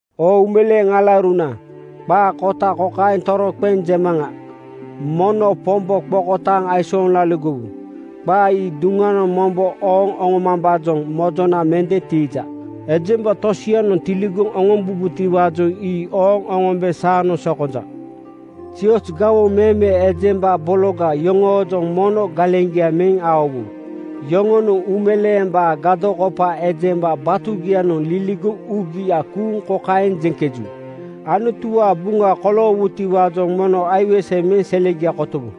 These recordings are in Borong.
Oo uumeleeŋ alauruna, qaa kota kokaeŋ toroqeŋ jemaŋa: Mono Pombo qokotaaŋ aisooŋ laligowu. Qaa ii duŋanoŋ mombo ooŋ oŋomambaajoŋ mojona mende tiija. Ejemba tosianoŋ tiligoŋ oŋombubotiwaajoŋ ii ooŋ oŋombe saanoŋ sokonja. Zioz gawoŋ meme ejemba bologa yoŋoojoŋ mono galeŋgia meŋ laligowu. Yoŋonoŋ uumeleembaa gadokopa ejemba batugianoŋ liligoŋ uugia kuuŋ kokaeŋ jeŋkeju, “Anutuwaa buŋa koloowutiwaajoŋ mono aiweseya meŋ selegia kotowu.”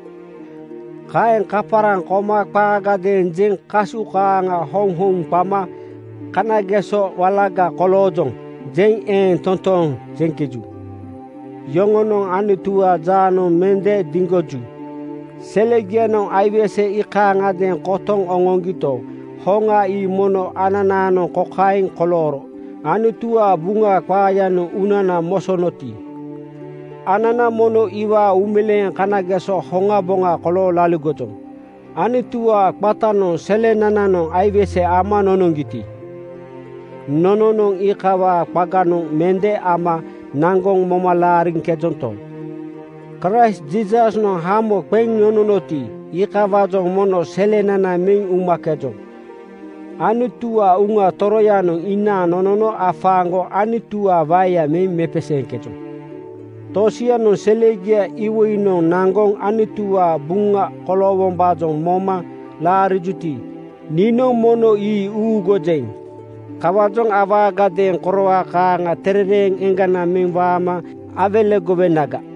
Kaeŋ kaparaŋ koma qaagadeeŋ jeŋ kasu kaaŋa houŋhouŋ qama “Kanageso walaga koloojoŋ,” jeŋ eeŋ totooŋ jeŋkeju. Yoŋonoŋ Anutuwaa jaanoŋ mende diŋgoju. Selegianoŋ aiwese iikayadeeŋ kotoŋ oŋoŋgito, hoŋa ii mono ananaanoŋ kokaeŋ kolooro: Anutuwaa Buŋa qaayanoŋ uunana mosonoti, anana mono iwaa uumeleeŋ kanageso hoŋaboŋa kolooŋ laligojoŋ. Anutuwaa qatanoŋ selenananoŋ aiwese ama nonoŋgiti, nononoŋ iikawaa qaganoŋ mende nama naŋgoŋ moma laariŋkejonto, Kraist Jiisasnoŋ hamo qeŋ nononoti, iikawaajoŋ mono selenana meŋ umakejoŋ. Anutuwaa Uŋa Toroyanoŋ inaaŋ nonono afaaŋgoŋ Anutuwaa waeya meŋ mepeseeŋkejoŋ. Tosianoŋ selegiaa iwoinoŋ naŋgoŋ Anutuwaa buŋa koloowombaajoŋ moma laarijuti, niinoŋ mono ii uŋuugujeŋ. Kawaajoŋ awaagadeeŋ koroa kaaŋa terereeŋ eŋgana meŋ waama awelegowenaga.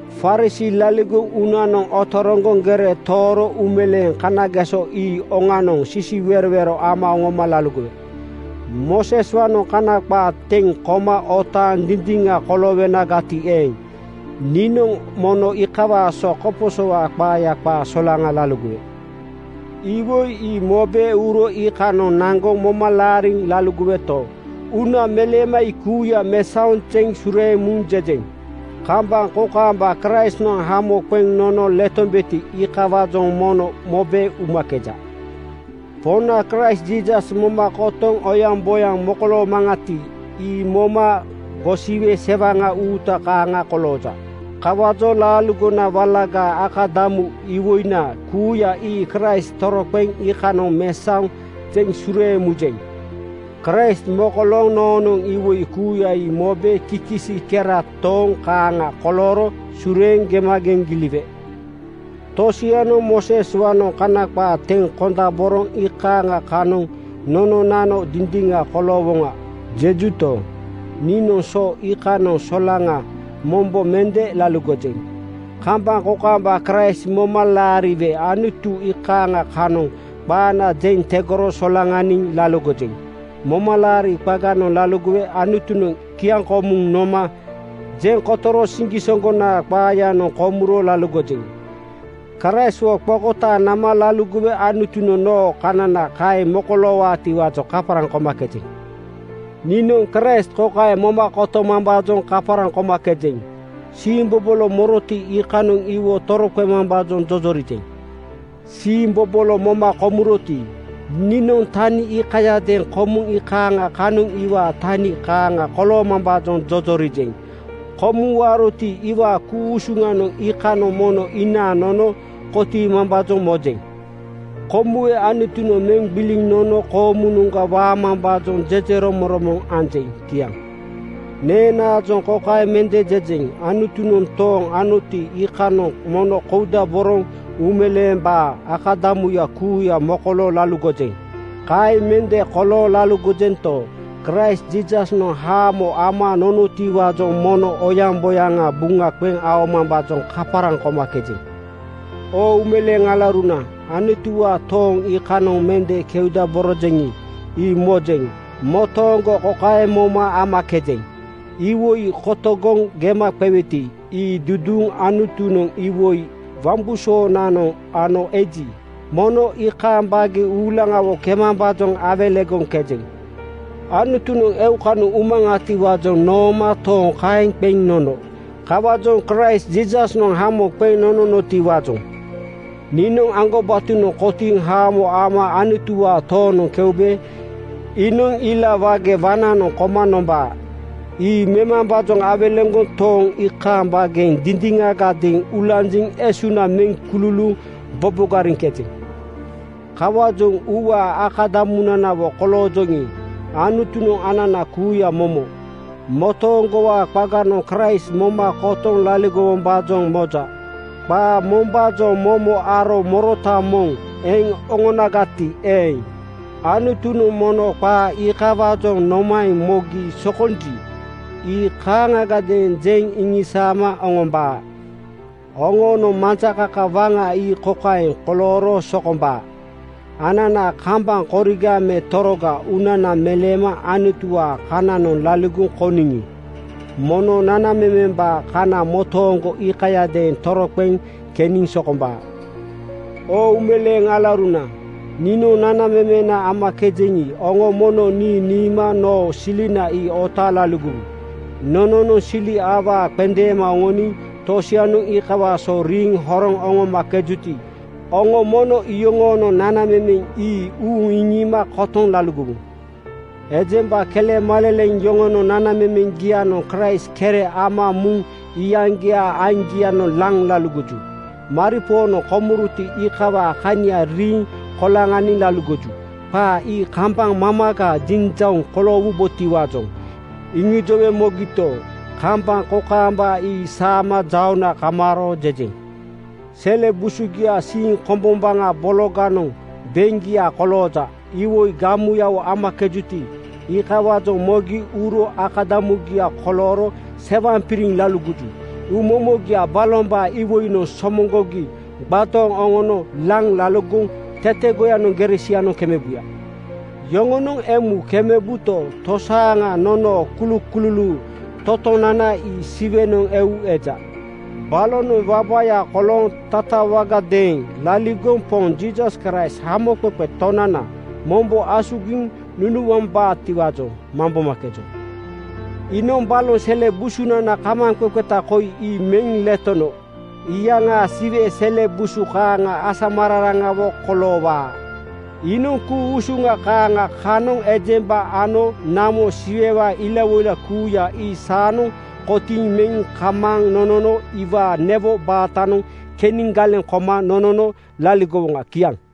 Farisii laligoŋ uunanoŋ otoroŋgoŋ gere tooro uumeleeŋ kanageso ii oŋanoŋ sisiwerowero ama oŋoma laligowe. Mooseswaanoŋ Kana qaa teŋ koma otaaŋ dindiŋa koloowonagati eeŋ, niinoŋ mono iikawaa so koposowaa qaaya qaa solaŋa laligowe. Iwoi ii mobe uro iikanoŋ naŋgoŋ moma laariŋ laligoweto, uuna meleema ii kuuya mesaoŋ zeŋ sureeŋ muŋ jejeŋ. Kambaŋ kokaamba Kraistnoŋ hamo qeŋ nono letombeti, iikawaajoŋ mono mobe umakeja. Poŋna Kraist Jiisas moma kotoŋ oyaŋboyaŋ mokoloomaŋati, ii moma gosiwe sewaŋa uuta kaaŋa kolooja. Kawaajoŋ laaligona walagaa akadamu iwoina kuuya ii Kraist toroqeŋ iikanoŋ mesaoŋ zeŋ sureeŋ mujeŋ. Kraist mokolooŋ noonoŋ iwoi kuuya ii mobe kikisi kera tooŋ kaaŋa kolooro sureeŋ gemageŋ giliwe. Tosianoŋ “Mooseswaanoŋ Kana qaa teŋ kondaboroŋ iikaaŋa kanoŋ nononano dindiŋa koloowoŋa,” jejuto, niinoŋ so iikanoŋ solaŋa mombo mende laligojeŋ. Kambaŋ kokaamba Kraist moma laariwe Anutunoŋ iikaaŋa kanoŋ qaana jeŋ tegoro solaŋaniŋ laligojeŋ. Momalaari qaganoŋ laligowe Anutunoŋ kiaŋkomuŋ noma jeŋ kotoro siŋgisoŋgonaa qaayanoŋ komuro laligojeŋ. Kraistwo qokotaaŋ nama laligowe Anutunoŋ noo kanana kaeŋ mokoloowaatiwaajoŋ kaparaŋ komakejeŋ. Niinoŋ Kraist kokaeŋ moma kotomambaajoŋ kaparaŋ komakejeŋ: Siimbobolo moroti, iikanoŋ iwo toroqemambaajoŋ jojorijeŋ. Siimbobolo moma komuroti, niinoŋ tani iikayadeeŋ komuŋ iikaaŋa kanoŋ iwaa tani kaaŋa koloomambaajoŋ jojorijeŋ. Komuŋ waaroti, iwaa ku-usuŋa iikanoŋ mono inaaŋ nono kotiimambaajoŋ mojeŋ. Komuwe Anutunoŋ meŋ gbiliŋ nono koomunoŋga waamambaajoŋ jejeromoŋromoŋ anjeŋ. Kiaŋ. Neenaajoŋ kokaeŋ mende jejeŋ, “Anutunoŋ tooŋ anoti, iikanoŋ mono koudaboroŋ uumeleembaa akadamuya kuuya mokolooŋ laligojeŋ.” Kaeŋ mende kolooŋ laligojento, Kraist Jiisasnoŋ haamo ama nonotiwaajoŋ mono oyaŋboyaŋa buŋa qeŋ aomambaajoŋ kaparaŋ komakejeŋ. Oo uumeleeŋ alauruna, Anutuwaa tooŋ iikanoŋ mende keudaborojeŋi, ii mojeŋ. Motooŋgo kokaeŋ moma amakejeŋ: Iwoi kotogoŋ gema qeweti, ii duduuŋ Anutunoŋ iwoi wambusoonanoŋ ano eji, mono iikaaŋ baageŋ uulaŋawo kemambaajoŋ awelegoŋkejeŋ. Anutunoŋ eukanoŋ umaŋatiwaajoŋ nooma tooŋ kaeŋ qeŋ nono. Kawaajoŋ Kraist Jiisasnoŋ hamo qeŋ nonotiwaajoŋ niinoŋ aŋgobatonoŋ kotiiŋ haamo ama Anutuwaa toonoŋ keube iinoŋ ila wage waŋnanoŋ koma nombaa. Ii memambaajoŋ awelegoŋ tooŋ iikaaŋ baageŋ dindiŋagadeeŋ ulanjiŋ esuna meŋ kululuuŋ bobogariŋkejeŋ. Kawaajoŋ uuwaa akadamunanawo koloojoŋi, Anutunoŋ anana kuuya momo motooŋgowaa qaganoŋ Kraist moma kotoŋ laligowombaajoŋ moja. Qaa mombaajoŋ momo aro morota moŋ eŋ oŋonagati eeŋ, Anutunoŋ mono qaa iikawaajoŋ nomaeŋ mogi sokonji, ii kaaŋagadeeŋ jeŋ iŋisaama oŋombaa. Oŋoonoŋ majakaka waŋa ii kokaeŋ kolooro sokombaa: Anana kambaŋ koriga me toroga uunana meleema Anutuwaa kananoŋ laligoŋ kouniŋi, mono nanamemembaa kana motooŋgo iikayadeeŋ toroqeŋ keniŋ sokombaa. Oo uumeleeŋ alauruna, niinoŋ nanamemena amakejeŋi, oŋo mono nii niima noo silina ii otaaŋ laligowu. Nononoŋ sili awaa qendeema oŋoniŋ tosianoŋ iikawaa so riiŋ horoŋ oŋomakejuti, oŋo mono iyoŋoonoŋ nanamemeŋ ii uuŋ iŋiima kotoŋ laligowu. Ejemba kelemaleleŋ yoŋonoŋ nanamemeŋgianoŋ Kraist kere ama muŋ iyaŋgiaa aiŋgianoŋ laŋ laligoju. Maripoonoŋ komuroti, iikawaa kania riiŋ koloŋaniŋ laligoju. Qaa ii kambaŋ mamaga jinjauŋ koloowubotiwaajoŋ iŋijowe mogito, kambaŋ kokaamba ii saama jauŋna kamaaro jejeŋ. Sele busugiaa siiŋ kombombaŋa bologanoŋ beŋgia kolooja. Iwoi gamuyawo amakejuti, iikawaajoŋ mogi uro akadamugia kolooro sewaŋpiriŋ laligoju. Uumomogia balombaa iwoinoŋ somoŋgogi gbadooŋ oŋono laŋ laligoŋ tetegoyanoŋ gere sianoŋ kemebuya. Yoŋonoŋ emu kemebuto, tosaaŋa nonoo kulukululuu totonana ii Siwenoŋ eu eja. Balonoŋ wabaya kolooŋ tatawagadeeŋ laligoŋ Poŋ Jiisas Kraist Hamoqeqe Tonananoŋ mombo asugiŋ nunuambaatiwaajoŋ mambomakejoŋ. Iinoŋ baloŋ sele busunana kamaaŋqeqeta koi ii meŋ letono iyaŋaa Siwe sele busu kaaŋa asamararaŋawo koloowaa. Ku-usuŋ kaaŋa ii Kraist eŋ muja. Iinoŋ ku-usuŋ kaaŋa kanoŋ ejemba ano namo Siwewaa ilawoila kuuya ii saanoŋ kotiiŋ meŋ kamaaŋ nonono iwaa newo baatanoŋ keniŋ galeŋ koma nonono laligowoŋa. Kiaŋ.